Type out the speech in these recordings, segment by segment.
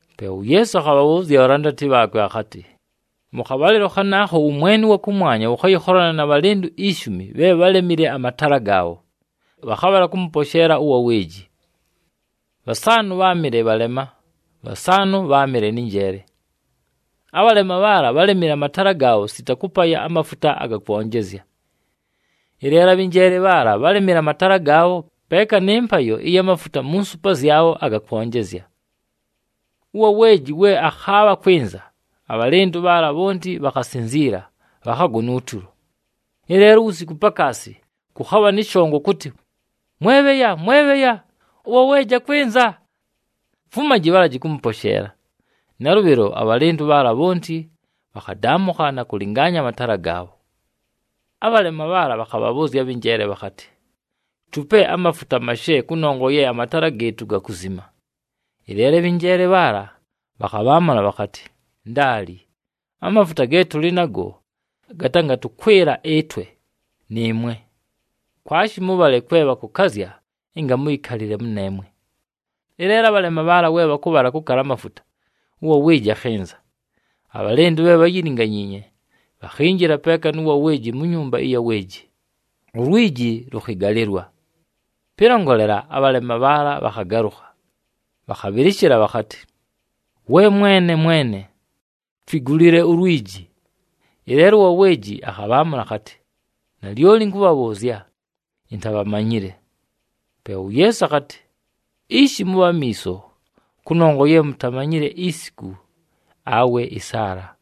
Pe uYeesu akhabhabhʉʉzya abhalandati bhaakwe akhatɨ, “Mʉ khabhalɨlo khanaakho ʉwʉmwene ʉwa kʉmwanya wʉkhayɨkholana na bhalɨndʉ ishumi bhe bhálemile amataala gaabho, bhakhabhala kʉmʉposheela ʉwa weeji. Bhasaanʉ bháamɨle bhalema, bhasaanʉ bháamɨle nɨ njeele. Abhalema bhaala bhálemile amataala gaabho sita kʉpaya amafuta aga kwonjezya. Ɨleelo abhɨ njeele bhaala bhálemile amataala gaabho peeka nɨ mpayo ɨya mafuta mu nsupa zyabho aga kwonjezya. Ʉwa weeji we akhaabha kwɨnza, abhalɨndʉ bhaala bhonti bhakhasinziila, bhakhagona utulo. Ɨleelo uwusiku pakaasi, kʉkhabha nɨ shongo kʉtɨ, ‘Mwebheya, mwebheya, ʉwa weeji akwɨnza! Fumaji, bhalaji kʉmʉposheela.’ Nalʉbhɨlo abhalɨndʉ bhaala bhonti bhakhadaamʉkha na kʉlɨngaanya amataala gaabho. “Abhalema bhaala bhakhabhabhʉʉzya abhɨ njeele bhakhatɨ, ‘Tupe amafuta mashe kʉnongwa ye amataala gɨɨtʉ gakuzima.’ Ɨleelo abhɨ njeele bhaala bhakhabhaamʉla bhakhatɨ, ‘Ndaali! Amafuta ge tʉlɨ nago, gatangatʉkwɨla ɨtwe, nɨɨmwe. Kwashi mʉbhale kwe bhakʉkazya ɨnga mʉyɨkalɨle mʉneemwe.’ “Ɨleelo abhalema bhaala we bhakʉbhala kʉkala amafuta, ʉwa weeji akhɨnza. Abhalɨndʉ bhe bháyilinganyiinye, bhakhinjila peeka nʉ wa weeji mu nyumba ɨya weeji, ulwiji lʉkhɨgalɨlwa. Pɨlongolela, abhalema bhaala bhakhagalʉkha, bhakhabhɨlɨshɨla bhakhatɨ, ‘We mwene! Mwene! Twigulile ulwiji!’ Ɨleelo ʉwa weeji akhabhaamʉla akhatɨ, ‘Nalyoli ɨnkʉbhabhʉʉzya, intabhamanyile!’” Pe uYeesu akhatɨ, “Ishi mʉbhe amiiso, kʉnongwa ye mutamanyile isiku awe ɨsaala.”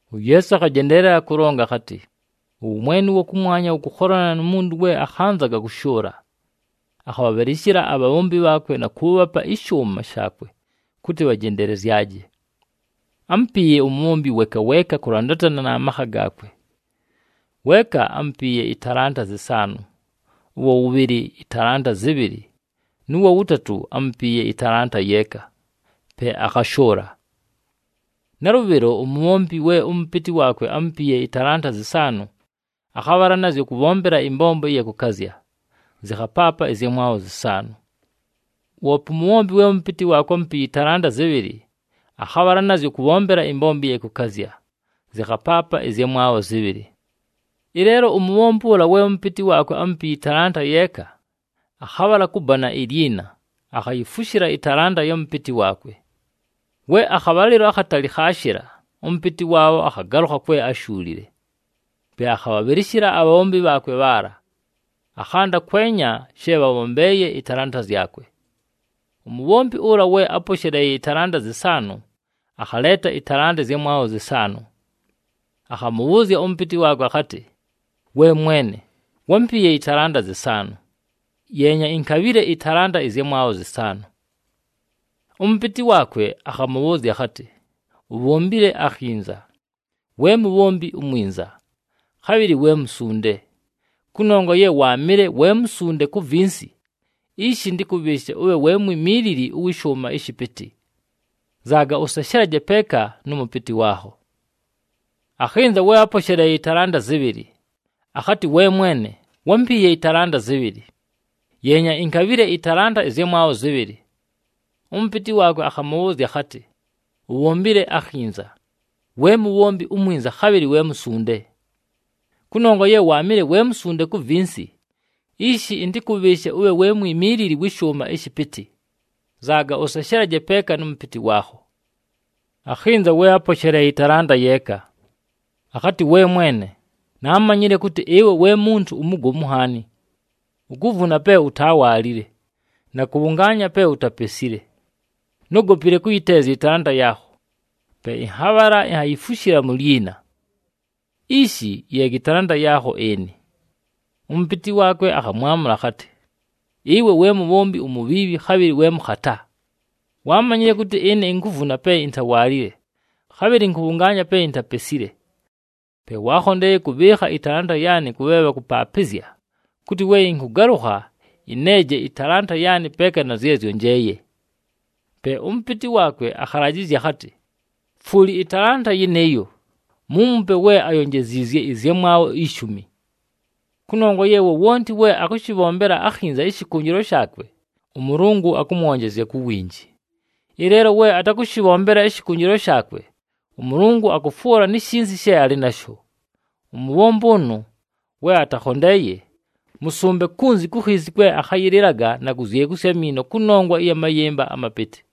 UYeesu akhajendeelela kʉlonga akhatɨ, “Ʉwʉmwene ʉwa kʉmwanya wʉkʉkholana nu muntu we akhanzaga kʉshʉʉla. Akhabhabhɨlɨshɨla abhabhombi bhaakwe na kʉʉbhapa ɨshʉʉma shaakwe kʉtɨ bhajendelezyaje. Ámupiiye umubhombi weeka weeka kʉlandatana na makha gaakwe. Weeka ámpiiye ɨtalanta zɨsaanʉ, ʉwa wʉbhɨlɨ ɨtalanta zɨbhɨlɨ nʉ wa wʉtatʉ ámupiiye ɨtalanta yeeka, pe akhashʉʉla. “Nalʉbhɨlo, umubhombi we ʉmʉpɨtɨ waakwe ámupiiye ɨtalanta zɨsaanʉ, akhabhala nazyo kʉbhombela ɨmbombo ɨya kʉkazya, zɨkhapaapa ɨzyamwabho zɨsaanʉ. Woope umubhombi we ʉmʉpɨtɨ waakwe ámupiiye ɨtalanta zɨbhɨlɨ, akhabhala nazyo kʉmbombela ɨmbombo ɨya kʉkazya, zɨkhapaapa ɨzyamwabho zɨbhɨlɨ. Ɨleelo umubhombi ʉla we ʉmʉpɨtɨ waakwe ámupiiye ɨtalanta yeeka, akhabhala kʉbana ilyina akhayifushila ɨtalanta ya mʉpɨtɨ waakwe. “We akhabhalɨlo akhatali khaashɨla, ʉmʉpɨtɨ waabho akhagalʉkha kwe áshuulile. Pe akhabhabhɨlɨshɨla abhabhombi bhaakwe bhaala, akhanda kwenya she bhabhombeeye ɨtalanta zyakwe. Umubhombi ʉla we áposheleeye ɨtalanta zɨsaanʉ, akhaleeta ɨtalanta ɨzyamwabho zɨsaanʉ, akhamʉbhʉʉzya ʉmʉpɨtɨ waakwe akhatɨ, ‘We mwene, wámpiiye ɨtalanta zɨsaanʉ, yeenya, inkabhile ɨtalanta ɨzyamwabho zɨsaanʉ.’ Ʉmʉpɨtɨ waakwe akhamʉbhʉʉzya akhatɨ, ‘Ubhombile akhinza, we mubhombi umwinza, khabhɨlɨ we musunde! Kʉnongwa ye waamɨle we musunde ku vinsi, ishi ɨntɨkʉbhɨɨshe ʉbhe we mwimiilili ʉwɨ shʉʉma ɨshɨpɨtɨ. Nzaaga ʉseshelaje peeka nʉ mʉpɨtɨ waakho.’ “Akhɨnza we áposheleeye ɨtalanta zɨbhɨlɨ, akhatɨ, ‘We mwene, wámpiiye ɨtalanta zɨbhɨlɨ, yeenya, inkabhile ɨtalanta ɨzyamwabho zɨbhɨlɨ.’ Ʉmʉpɨtɨ waakwe akhamʉbhʉʉzya akhatɨ, ‘Ubhombile akhinza, we mubhombi umwinza, khabhɨlɨ we musunde! Kʉnongwa ye waamɨle we musunde ku vinsi, ishi ɨntɨkʉbhɨɨshe ʉbhe we mwimiilili wɨ shʉʉma ɨshɨpɨtɨ. Nzaaga ʉseshelaje peeka nʉ mʉpɨtɨ waakho.’ “Akhɨnza we áposheleeye ɨtalanta yeeka, akhatɨ, ‘We mwene, naamanyile kʉtɨ ɨwe we muntu umugomu nhaani. Ukuvuna pe utawaalile na kʉbhʉngaanya pe utapesile. Nógopile kʉyɨteezya ɨtalanta yaakho, pe ɨnhabhala inhayifushila mu lyina. Ishi, yeega ɨtalanta yaakho ɨnɨ.’ Ʉmʉpɨtɨ waakwe akhamwamʉla akhatɨ, ‘Ɨwe we mubhombi umubhiibhi khabhɨlɨ we mʉkhata! Waamanyile kʉtɨ ɨne inkuvuna pe intawaalile, khabhɨlɨ ɨnkʉbhʉngaanya pe intapesile. Pe waakhondeeye kʉbhɨɨkha ɨtalanta yaanɨ kʉ bhe bhakʉpaapɨzya kʉtɨ we ɨnkʉgalʉkha ɨneeje ɨtalanta yaanɨ peeka na zye zyonjeeye.’ Pe ʉmʉpɨtɨ waakwe akhalajɨzya akhatɨ, ‘Fwuli ɨtalanta yɨnɨɨyo, muumupe we ayonjeziizye ɨzyamwabho ishumi.’ Kʉnongwa ye wowonti we akʉshɨbhombela akhinza ɨshɨkʉnjɨlwa shaakwe, ʉMʉlʉngʉ akʉmwonjezya ku winji. Ɨleelo we atakʉshɨbhombela ɨshɨkʉnjɨlwa shaakwe, ʉMʉlʉngʉ akʉfwʉla ni shinsi she alɨ nasho. Umubhombi ʉnʉ we atakhondeeye, mʉsʉmbe kunzi ku khiisi kwe akhayɨlɨlaga na kuzyekusya amiino kʉnongwa ya mayɨmba amapɨtɨ.”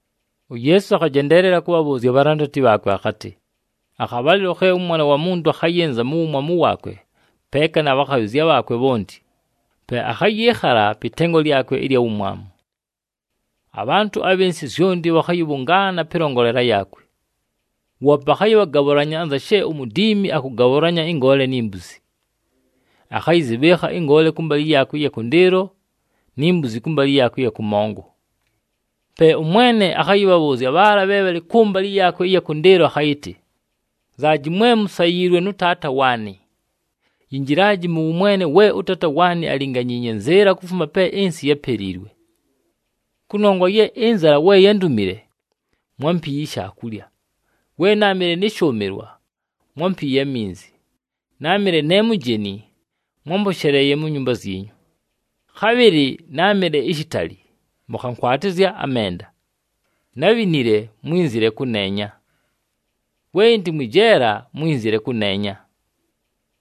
UYeesu akhajendeelela kʉbhabhʉʉzya abhalandati bhaakwe akhatɨ, “Akhabhalɨlo khe ʉMwana wa Muntu akhayɨnza mu wumwamu waakwe peeka na bhakhabhɨzya bhaakwe bhonti, pe akhayɨɨkhala pɨ tengo lyakwe ɨlya wumwamu. Abhantʉ abhɨ nsɨ zyonti bhakhayɨbhʉngaana pɨlongolela yaakwe. Woope akhayɨbhagabhʉlanya anza she umudiimi akʉgabhʉlanya ɨngoole ni mbuzi. Akhayɨzɨbhɨɨkha ɨngoole kʉmbalɨ yaakwe ɨya kʉndɨɨlo ni mbuzi kʉmbalɨ yaakwe ɨya kʉmongo. “Pe ʉMwene akhayɨbhabhʉʉzya bhaala bhe bhalɨ kʉmbalɨ yaakwe ɨya kʉndɨɨlo akhayɨtɨ, ‘Nzaaji, mwe musayiilwe nʉ Taata waanɨ. Yinjilaji mʉ wʉmwene we ʉTaata waanɨ álinganyiinye nzɨɨla kufuma pe ɨnsɨ yápeliilwe. Kʉnongwa ye ɨnzala we yándumile, mwámpiiye ishaakulya, we náamɨle nɨ shʉʉmɨlwa, mwámpiiye aminzi, náamɨle ne mujeni, mwámposheleeye mu nyumba zyinyu. Khabhɨlɨ náamɨle ishitali, mʉkhankwatɨzya amenda, nábhinile, mwínzile kʉneenya. We ɨndɨ mwɨ jeela, mwínzile kʉneenya.’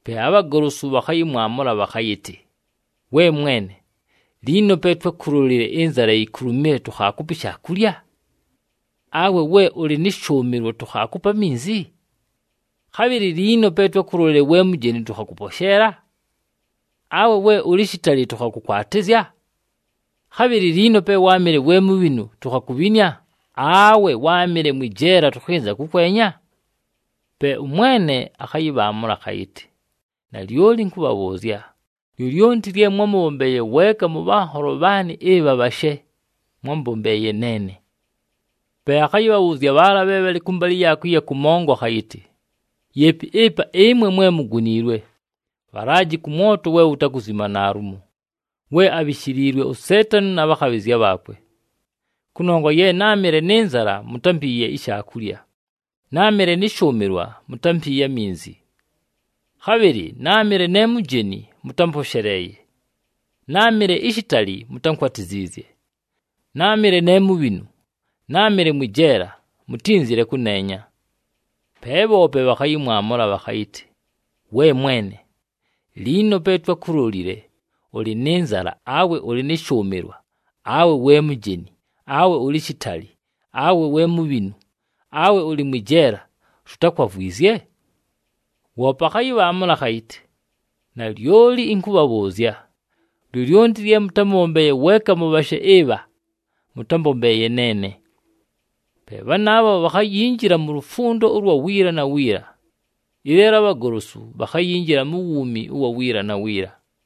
Pe abhagolosu bhakhayɨmwamʉla bhakhayɨtɨ, ‘We Mwene, liino pe twákulolile ɨnzala yikulumile, tukhaakupa ishaakulya? Awe we ʉlɨ nɨ shʉʉmɨlwa tukhaakupa aminzi? Khabhɨlɨ liino pe twákulolile we mujeni tʉkhakʉposheela? Awe we ʉlɨ shitali tʉkhakʉkwatɨzya? Khabhɨlɨ liino pe wáamɨle we mubhinu tukhakubhinia, awe we wáamɨle mwɨ jeela tʉkhɨnza kʉkwenya?’ Pe ʉMwene akhayɨbhaamʉla akhayɨtɨ, ‘Nalyoli ɨnkʉbhabhʉʉzya, lyolyonti lye mwámʉbhombeeye weeka mʉ bhanholo bhaanɨ ɨbha bhashe, mwámbombeeye neene.’ “Pe akhayɨbhabhʉʉzya bhaala bhe bhalɨ kʉmbalɨ yaakwe ɨya kʉmongo akhayɨtɨ, ‘Yeepi ɨpa ɨmwe mwe muguniilwe! Bhalaji kʉ mwoto we wutakuzima naalumo, we abhishiliilwe uSeetani na bhakhabhɨzya bhaakwe. Kʉnongwa ye náamɨle nɨ nzala, mutámpiiye ishaakulya, náamɨle nɨ shʉʉmɨlwa, mutámpiiye aminzi. Khabhɨlɨ náamɨle ne mujeni, mʉtámposheleeye, náamɨle ishitali, mutánkwatiziizye. Náamɨle ne mubhinu, náamɨle mwɨ jeela, mutínzile kʉneenya.’ “Pe bhoope bhakhayɨmwamʉla bhakhayɨtɨ, ‘We Mwene, liino pe twákulolile, ʉlɨ nɨ nzala awe ʉlɨ nɨ shʉʉmɨlwa, awe we mujeni, awe ʉlɨ shitali, awe we mubhinu, awe ʉlɨ mwɨ jeela, tutákwavwizye?’ Woope akhayɨbhaamʉla akhayɨtɨ, ‘Nalyoli ɨnkʉbhabhʉʉzya, lyolyonti lye mʉtámʉbhombeeye weeka mʉ bhashe ɨbha, mʉtámbombeeye neene.’ “Pe bhanaabho bhakhayinjila mu lufundo ʉlwa wiila na wiila. Ɨleelo abhagolosu bhakhayinjila mu wuumi ʉwa wiila na wiila.”